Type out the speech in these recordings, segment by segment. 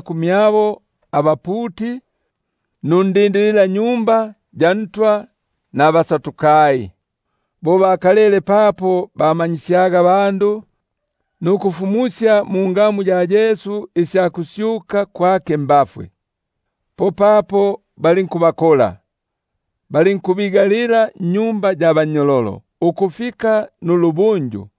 kumyabo abaputi, nundindilila-Tempeli nabaSadukai; bo bakalele papo bamanyisyaga abandu nukufumusya mungamu ya Yesu isya kusyuka mbafwe. Popapo balinkubakola, balinkubigalila nnyumba ya bannyololo ukufika nulubunju,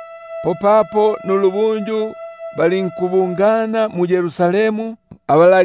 Popapo nulubunju balinkubungana mu-Yerusalemu abala-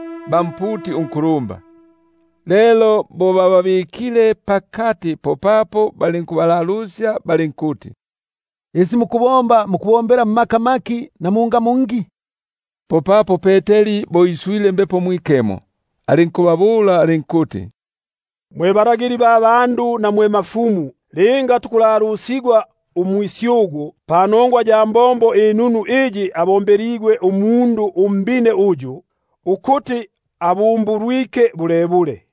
ba mputi unkulumba. Lelo bo bababikile pakati, popapo balinkubalalusya balinkuti: Isi mukubomba, mukubombela mmaka maki, na mungamu ngi? Popapo Peteri bo iswile Mbepo Mwikemo, alinkubabula alinkuti: Mwe balagili ba bandu, na mwe bakulumba, linga tukulongigwa umusyugu panongwa ya mbombo inunu iyi tumbombile umundu umbine uyu, ukuti abumbulwike bulebule,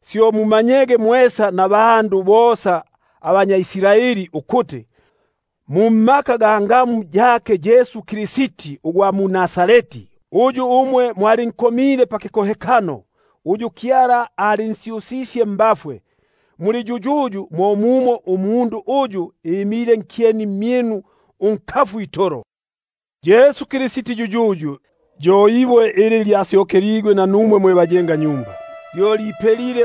syo mumanyege mwesa nabandu bosa abanyʼIsraeli ukuti, mungamu ya Yesu Kristi ugwa mu-Nazareti, uyu mwalinkomile pakikohekano, uyu Kyala alinsyusisye mbafwe, muli yuyuyu, mo mumo umundu uyu imile nkyeni mmyinu unkafu itolo. Yesu yuyuyu, yo ibwe ili lyasyokeligwe nanumwe mwe bayengi, lyo lipelile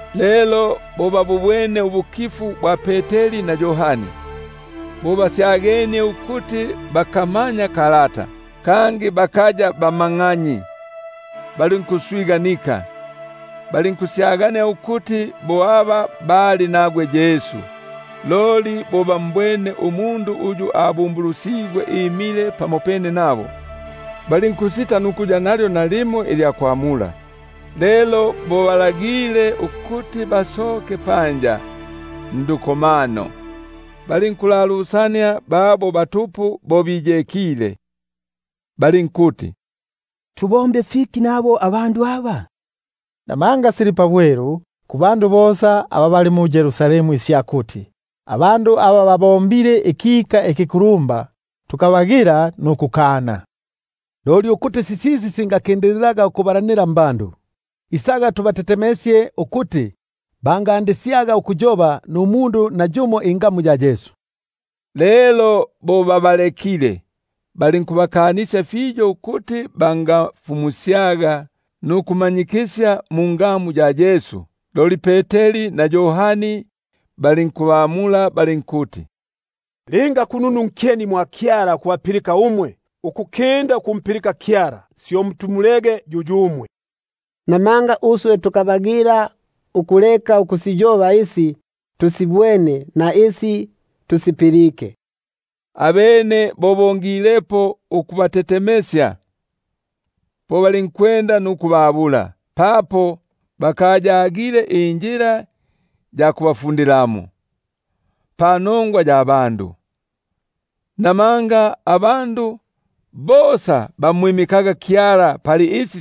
Lelo bo babubwene ubukifu bwa Peteri na Yohani, bo basyagenie ukuti bakamanya kalata, kangi bakaya bamaganyi, balinkuswiganika, balinkusyagania ukuti bo aba bali nagwe Yesu. Loli bo bambwene umundu uyu abumbulusigwe imile pamopene nabo, balinkusita nukuya nalyo nalimo ilya kwa- mula. Lelo bo babalagile ukuti basokemo ndukomano, balinkulalusania babo batupu, balinkuti: Tubombe fiki nabo abandu aba? Buno sili pabwelu kuli bosa aba bali mu-Yerusalemu isya kuti, abandu aba babombile ikika ikikulumba, kangi tukabagila nukukana. Loli ukuti sisisi singakindililaga ukubalanila mbandu, isaga tubogofye, ukuti bangandisyaga ukuyoba numundu yumo mungamu yiyiyi. Lelo bo bababilikile, balinkubakanisya fiyo nkufumusya nukumanyikisya mungamu ya Yesu. Loli Peteri na Yohani balinkubamula balinkuti: Linga kununu nkyeni mwa Kyala ukubapilika umwe, ukukinda ukumpilika Kyala, syo mulongege yuyumwe; buno uswe tukabagila ukuleka ukusiyoba isi tusibwene nisi tusipilike. Abene bo bongilepo ukubogofya, po balinkubabula, papo bakayagile injila ya kubafundilamo, panogwa ya bandu; namanga abandu bosa bamwimikaga Kyala pali isi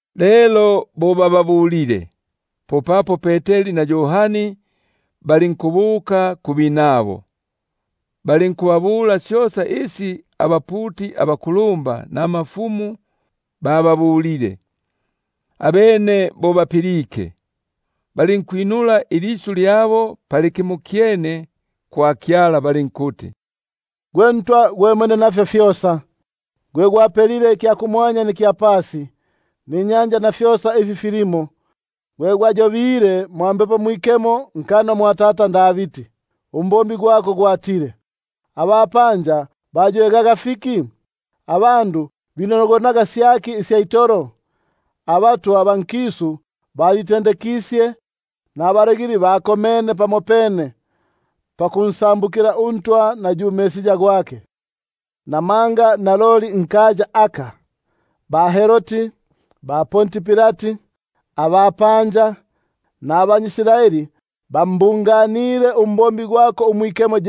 Lelo bo bababwile, popapo balinkubuka kubinabo, balinkubapangila syosa isi abaputi abakulumba, nabakulumba baba- bulile. Abene bo bapilike, balinkwinula ilisyu lyabo pali kimokyene kwa Kyala balinkuti: Gwe Ntwa gwe Mwenefyosa, gwe gwapelile ikya kumwanya nikya pasi, ninyanja na fyosa ifi filimo, gwe gwayobile mwa Mbepo Mwikemo nkanwa mwa tata Davidi, umbombi gwako gwatile: Abapanja baywegaga fiki, Nifikolo fya bandu finogonaga syaki isya itolo? Abatwa ba nkisu bitendekisye, Nabalagili bakomene pamopene, Bansambukile uNtwa na yu Mpakigwa gwake. Buno naloli nkaya aka, ba-Herodi, ba-Ponti Pilati, abapanja nabanyʼIsraeli bambunganile umbombi gwako umwikemo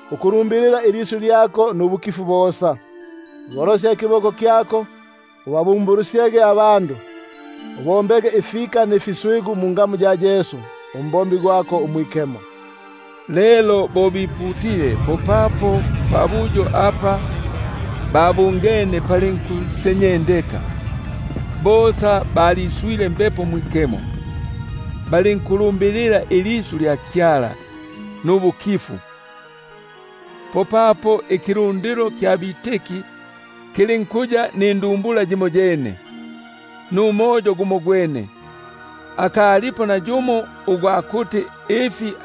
ukuliyoba ilisyu lyako nubukifu bosa, bo kugolosya ikiboko kyako nkubumbulusya, nukubomba ifika mfiswigu mungamu ya Yesu, umbombi gwako umwikemo. Lelo bo biputile, popapo pabuyo apa babungene palinkusenyendeka; bosa balinkwisula Mbepo Mwikemo, balinkuliyoba ilisyu lya Kyala nubukifu. Popapo ikilundilo kya aba balitike lulinkuya nindumbula yimoyene, numoyo gumogwene, akalipo nayumo ugwa kuti ifi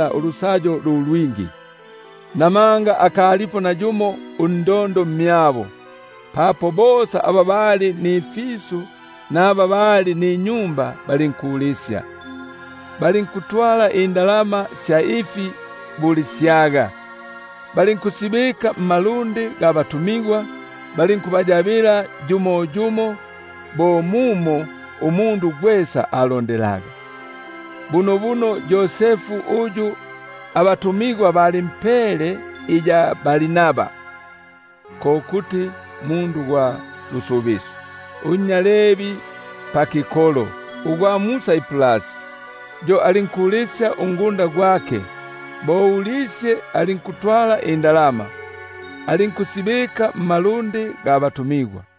nabo bosa. Namanga akalipo nayumo undondo mmyabo, papo bosa aba bali nifisu naba bali ninyumba balinkulisya, balinkutwala indalama sya ifi bulisyaga, balinkusibona mmalundi ga batumigwa, balinkubayabila yumo yumo bo mumo umundu gwesa agililwaga. Bunobuno Yosefu uyu abatumigwa balimpele iya Barnaba, (ko kuti nnya lusubisyo), unnya Levi pakikota, ugwa mu-Saiprasi, yo alinkulisya ungunda gwake; bo ulisye, alinkutwala indalama, alinkusibika mmalundi ga batumigwa.